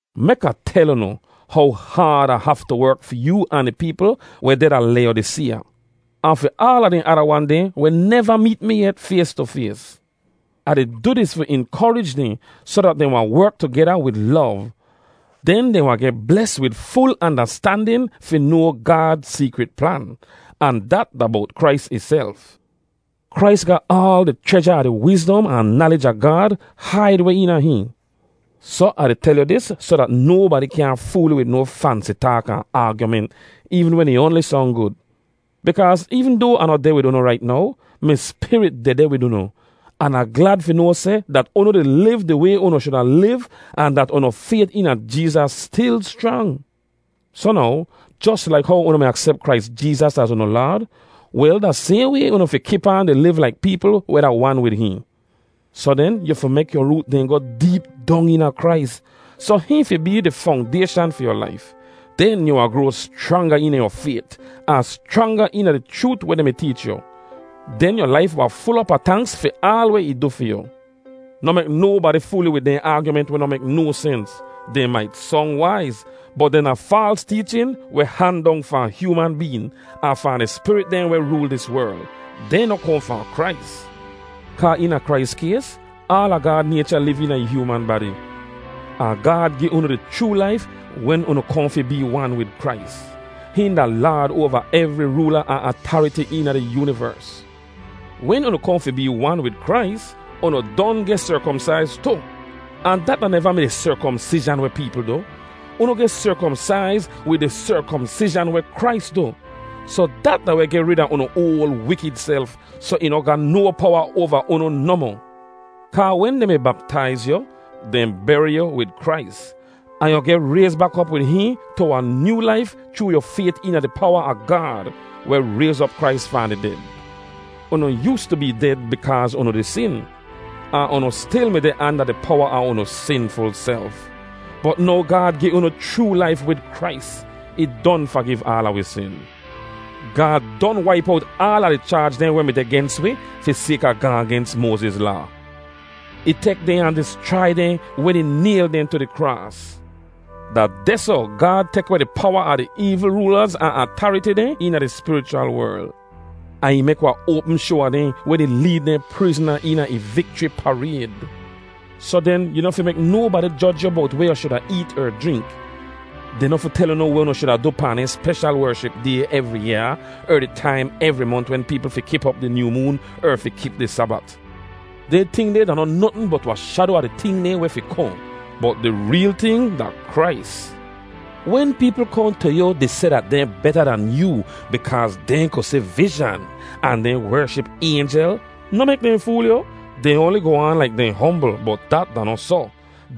Mek Ah tel unu how haad Ah haftu werk fi yoo ahn di peepl weh deh da Layodiseeya, ahn fi aala dehn ada wan dehn weh neva meet mi yet fays tu fays. Ah di du dis fi inkorij dehn soh dat dehn wahn werk tugeda wid lov. Den dehn wahn geh bles wid ful andastandin fi noa Gaad seekrit plan, ahn dat da bowt Krais ihself. Krais ga aal di chreja a di wizdom ahn nalij a Gaad haid weh eena hihn. Soh Ah di tel yu dis soh dat nobadi kyaahn fool yu wid no fansi taak ahn aagyument eevn wen ih oanli song gud. Bikaaz eevn doa Ah noh deh wid unu rait now, mi spirit dehdeh wid unu, an Ah glad fi noa seh dat unu di liv di way unu shuda liv ahn dat unu fayt eena Jeezas stil schrang. Soh now, jos laik how unu mi aksep Krais Jeezas az unu Laad, wel da sayhn way unu fi kip aan di liv laik peepl weh da wan wid hihn. Soh den yu fi mek yu root dehn goh deep dong eena Krais, soh hihn fi bee di fongdayshan fi yu laif. Den yu wahn groa schranga eena yu fayt ahn schranga eena di chroot weh dehn mi teech yu. Den yu laif wahn ful op a tanks fi aal weh ih du fi yu. Noh mek nobadi fool yu wid dehn aagyument weh noh mek no sens. Dehn mait song waiz, bot dehn da faals teechin weh han dong fahn hyooman been, ahn fahn di spirit dehn weh rool dis werl. Dehn noh kohn fahn Krais. Kaa eena Krais kays, aala Gaad naycha liv eena ih hyooman badi. Ahn Gaad gi unu di chroo laif wen unu kohn fi bee wan wid Krais. Hihn da Laad oava evri roola ahn atariti eena di yoonivers. Wen unu kohn fi bee wan wid Krais, unu don geh serkomsaiz tu. Ahn dat da neva mi di serkomsizhan weh peepl du. Unu geh serkomsaiz wid di serkomsizhan weh Krais du. Soh dat da weh geh rid a unu oal wikid self soh ih noh ga no powa oava unu nohmoh. Kaa wen dehn mi baptaiz yu, dehn beri yu wid Krais, ahn yu geh rayz bak op wid hihn tu wahn nyoo laif chroo yu fayt eena di powa a Gaad, weh rayz op Krais fahn di ded. Unu yoostu bee ded bikaaz unu di sin, ahn unu stil mi deh anda di powa a unu sinful self. Bot now Gaad gi unu chroo laif wid Krais; ih don fagiv aala wi sin. Gaad don waip owt aala di chaaj dehn weh mi deh gens wi fi sayka gaahn gens Moaziz Laa. Ih tek dehn ahn dischrai dehn wen ih nayl dehn tu di kraas. Da dehsoh Gaad tek weh di powa a di eevl roolaz ahn atariti dehn eena di spirichwal werl. Ahn ih mek wahn oapm shoa a dehn wen ih leed dehn prizna eena ih vikchri parayd. Soh den, yu noh fi mek nobadi joj yu bowt weh yu shuda eet er jrink. Dehn noh fi tel unu weh unu shuda du pahn dehn speshal wership day evri yaa er di taim evri mont wen peepl fi kip op di nyoo moon er fi kip di Sabat. Dehn ting deh da noh notn bot wahn shado a di ting dehn weh fi kohn, bot di reel ting da Krais. Wen peepl kohn tu yu di seh dat dehn beta dan yoo bikaaz dehn ku si vizhan, ahn dehn wership aynjel, noh mek dehn fool yu. Dehn oanli goh aan laik dehn hombl bot dat da noh soh.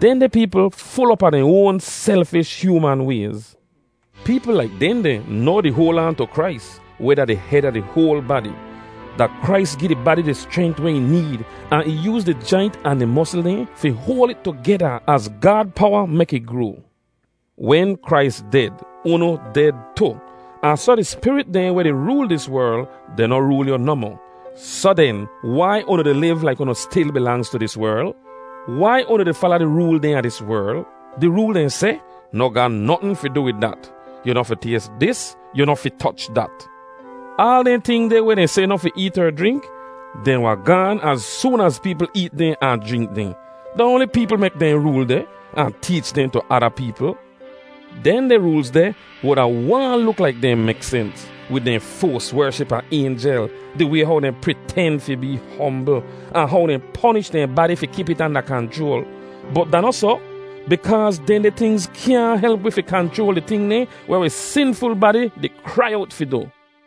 Dehndeh peepl ful op a dehn oan selfish, hyooman wayz. Peepl laik dehndeh noh di hoal aan tu Krais, weh da di hed a di hoal badi. Da Krais gi di badi di schrent weh ih need ahn ih yooz di jaint ahn di mosl dehn fi hoal it tugeda az Gaad powa mek ih groa. Wen Krais ded, unu ded tu, ahn soh di spirit dehn weh di rool dis werl, dehn noh rool yu nohmoh. Soh den, wai unu di liv laik unu stil bilangz tu dis werl? Wai unu di fala di rool dehn a dis werl? Di rool dehn seh, “Noh ga notn fi du wid dat! Yu noh fi tays dis! Yu noh fi toch dat!” Aal dehn ting deh weh dehn seh noh fi eet er jrink, dehn wahn gaan az soon az peepl eet dehn ahn jrink dehn. Da oanli peepl mek dehn rool deh ahn teech dehn tu ada peepl. Dehndeh roolz deh wuda waahn luk laik dehn mek sens, wid dehn foas wership a aynjel, di way how dehn priten fi bee hombl, ahn how dehn ponish dehn badi fi kip it anda kanchroal. Bot da noh soh, bikaaz dehndeh tingz kyaahn help wi fi kanchroal di ting dehn weh wi sinful badi di krai owt fi du.